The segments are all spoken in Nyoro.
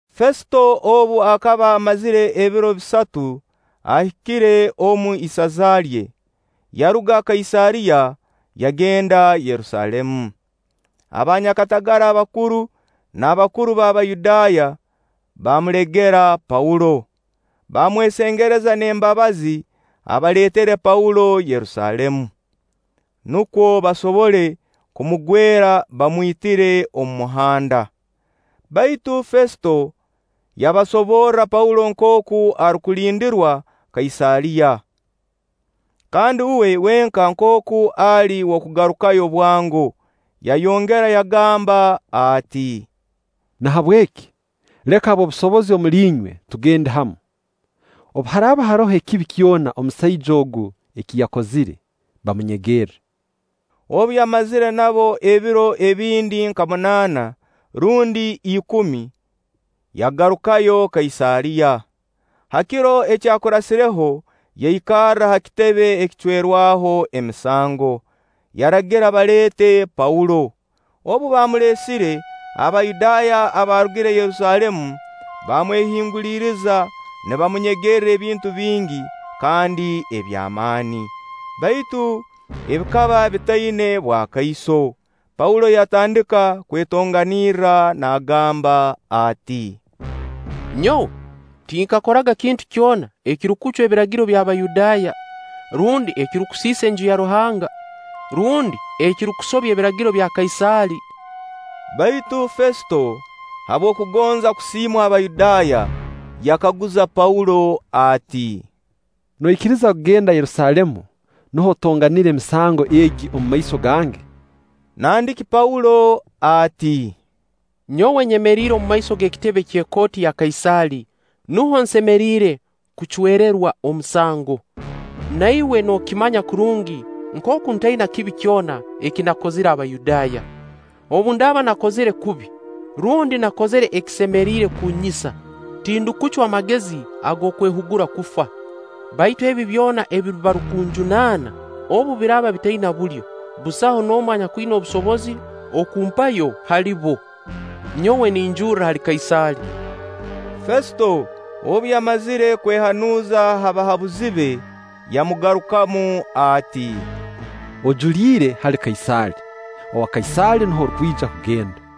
Fesito obu akaba amazire ebiro bisatu ahikire omu isaza lye, yaruga Kaisaariya, yagenda Yerusaalemu. Abanyakatagara abakuru n'abakuru b'Abayudaaya baamulegera Paulo; baamwesengereza n'embabazi abaleetere Paulo Yerusaalemu, nukwo basobole kumugwera, bamwitire omu muhanda. Baitu Fesito yabasoborra Paulo nkooku arukulindirwa Kaisaariya, kandi uwe wenka nkooku ali w'okugarukayo bwango. Yayongera yagamba ati: “Nahabweki, leka ab'obusobozi omuli inywe tugende hamu. Obu haraaba haroho ekibi kyona musaija ogu eki yakozire, bamunyegerre.” Obu yamazire nabo ebiro ebindi nka munaana rundi ikumi, yagarukayo Kaisaariya. Ha kiro ekyakurasireho yaikarra ha kitebe ekicwerwaho emisango, yaragira baleete Paulo. Obu baamuleesire, Abayudaaya abaarugire Yerusaalemu baamwehinguliriza nibamunyegerra ebintu bingi kandi eby'amaani, baitu ebikaba bitaina bwakaiso. Paulo yatandika kwetonganirra naagamba ati: “Nyowe tinkakoraga kintu kyona ekirukucwa Ebiragiro by'Abayudaaya, rundi ekirukusiisa Enju ya Ruhanga, rundi ekirukusobya ebiragiro bya Kaisaali.” Baitu Fesito, habw'okugonza kusiimwa Abayudaaya, yakaguza Paulo ati: “Noikiriza kugenda Yerusaalemu, nuho otonganire emisango egi omumaiso gange?” Nandiki Paulo ati: “Nyowe nyemeriire omumaiso g'ekitebe ky'ekooti ya Kaisaali, nuho nsemeriire kucwererwa omusango. Na iwe nookimanya kurungi nkooku ntaina kibi kyona eki nakozire Abayudaaya. Obu ndaaba nakozire kubi, rundi nakozire ekisemeriire kunnyisa, tindukucwa magezi ag'okwehugura kufa. Baitu ebi byona ebi barukunjunaana, obu biraaba bitaina bulyo, busaho n'omu anyakwina obusobozi okumpayo hali bo. Nyowe ninjurra hali Kaisaali.” Fesito obu yamazire kwehanuuza ha bahabuzi be, yamugarukamu ati; “Ojuliire hali Kaisaali, owa Kaisaali nuho orukwija kugenda.”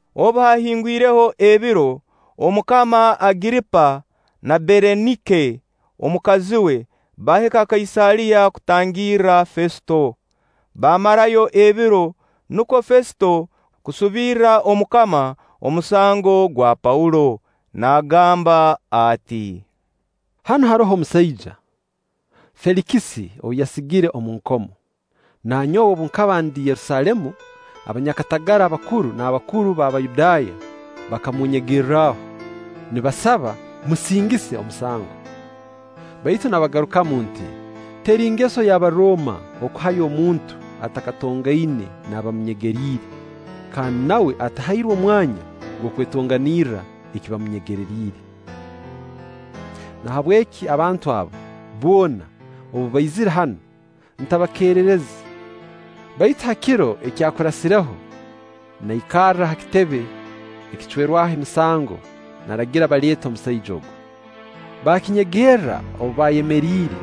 Obu haahingwireho ebiro, Omukama Agiripa na Bereniike omukazi we baahika Kaisaariya kutangirra Fesito. Baamarayo ebiro; nukwo Fesito kusubirra Omukama omusango gwa Paulo, naagamba ati; “Hanu haroho omusaija, Feelikisi ou yasigire omu nkomo; na nyowe obu nkaba ndi Yerusaalemu, abanyakatagara abakuru n'abakuru b'Abayudaaya bakamunnyegerraho, nibasaba mmusingise omusango. Baitu nabagarukamu nti: ‘Teri ngeso y'Abarooma kuhayo omuntu atakatongaine n'abamunyegeriire, kandi nawe atahairwe omwanya gw'okwetonganirra eki bamunyegereriire.’ Nahabweki abantu abo boona obu baizire hanu, ntabakerereze, baitu ha kiro ekyakurasireho naikarra ha kitebe ekicwerwaho emisango, naragira baleete omusaija ogu. Baakinyegerra obu baayemeriire,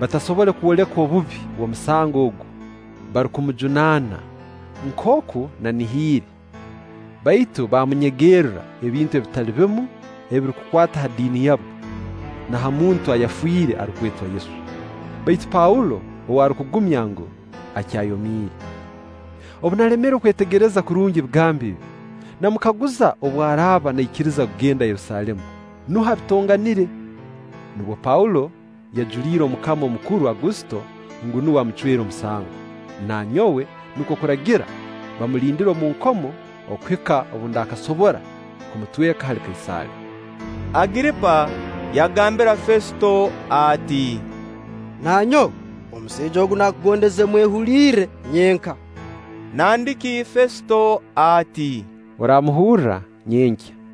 batasobole kwoleka obubi obw'omusango ogu barukumujunaana nkooku nanihiire; baitu baamunyegererra ebintu ebitali bimu ebirukukwata ha diini yabo, na ha muntu ayafiire arukwetwa Yesu; baitu Paulo ou arukugumya ngu, akyayomiire. Obu nalemerwe kwetegereza kurungi ebigambo ebi, namukaguza obu araaba naikiriza kugenda Yerusaalemu, nuho abitonganire. Nubwo Paulo yajuliire Omukama Omukuru Agusito ngu nuwe amucwere omusango; na nyowe nukwo kuragira bamulindire omu nkomo okuhika obu ndakasobora kumutweka hali Kaisaali.” Agiripa yagambira Fesito ati: “Na nyowe, omusaija ogu naakugondeze kumwehulirra nyenka.” Nandiki Fesito ati: “Oramuhurra nyenkya.”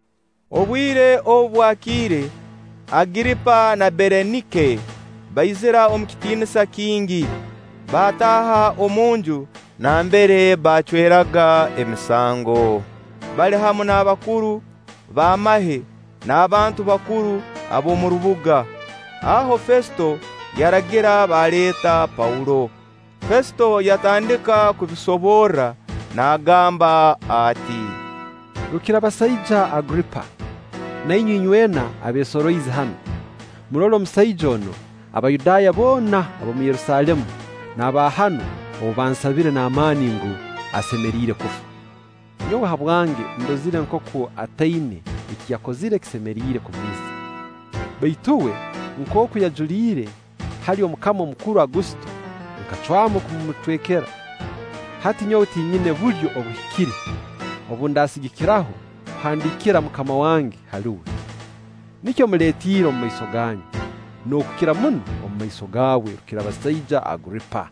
Obwire obu bwakiire, Agiripa na Bereniike baizira omu kitiinisa kingi, baataaha omunju nambere baacweraga emisango, bali hamu n'abakuru b'amahe n'abantu bakuru ab'omu rubuga. Aho Fesito yaragira baleete Paulo. Fesito yatandika kubisoborra naagamba ati: “Rukirabasaija Agiripa, na inywe inywena abeesoroize hanu, murole omusaija onu Abayudaaya boona ab'omu Yerusaalemu n'aba hanu ou baansabire n'amaani ngu, asemeriire kufa. Nyowe habwange ndozire nkooku ataina eki yakozire ekisemeriire kumwisa. Baitu uwe nkooku yajuliire hali Omukama Omukuru Agusito, nkacwamu kumumutwekera. Hati nyowe tinyina bulyo obuhikire obu ndaasigikiraho kuhandiikira mukama wange hali uwe. Nikyo mmuleetiire omumaiso ganyu, n'okukira muno omumaiso gaawe, Rukirabasaija Agiripa.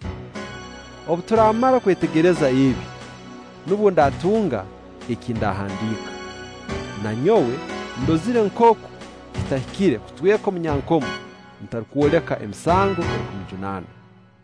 Obu turamara kwetegereza ebye, nubwo ndatunga eki ndaahandiika. Na nyowe ndozire nkooku kitahikire kutweka omunyankomo, ntarukwoleka emisango erukumujunanwa.”